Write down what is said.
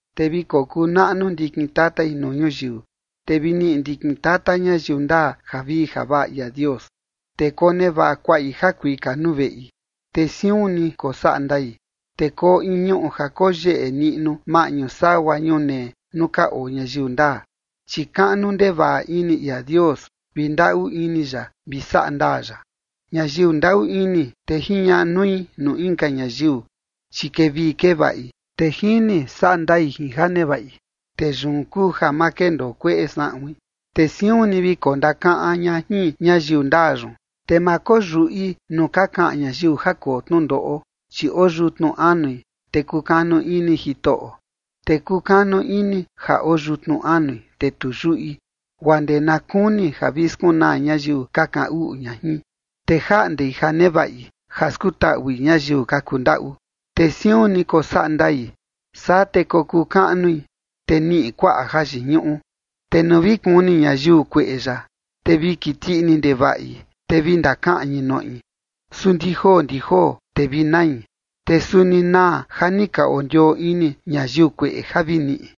Te vi kokuu naꞌnu ndikin tatai nuu ñuyiu, te vi niꞌi ndikin tata ñayiu ndaa javii javaꞌa ia Dios. Te konevaꞌa kuaꞌi jakuika nuu veꞌi, te siun ni kosaꞌa ndai. Te koo in ñuꞌu ja koyeꞌe niꞌnu maꞌñu sagua ñunee nuu ka oo ñayiu ndaa, chi kaꞌnu ndevaꞌa ini ia Dios vi ndaꞌu ini ya vi saꞌa ndaa ya. Ñayiu ndaꞌu ini, te jiñaꞌa nui nuu inka ñayiu, chi kevii kevaꞌi, te jini saꞌa ndai jin ja nevaꞌi. Te yun kuu ja ma kendoo kueꞌe saꞌuin, te siun ni vi kondakaꞌan ña jin ñayiu ndaa yun. Te ma koyuꞌi nuu ka kaꞌan ñayiu ja koo tnundoꞌo, chi oo yutnu anui, te kukanu ini Jitoꞌo. Te kukanu ini ja oo yutnu anui, te tu yuꞌi, guaa ndee na kuni ja vi skunaa ñayiu ka kaꞌan uꞌu ña jin. Te jaꞌndei ja nevaꞌi ja skutaꞌui ñayiu ka kundaꞌu, te siun ni kosaꞌa ndai, saa te kokuu kaꞌnui, te niꞌi kuaꞌa jayiñuꞌu. Te nuu vi kuni ñayiu kueꞌe yaꞌa, te vi kiti ini ndevaꞌi, te vi ndakaꞌñi noꞌi, su ndi joo ndi joo te vi nai, te suni naa ja ni ka ondioo ini ñayiu kueꞌe ja vi niꞌi.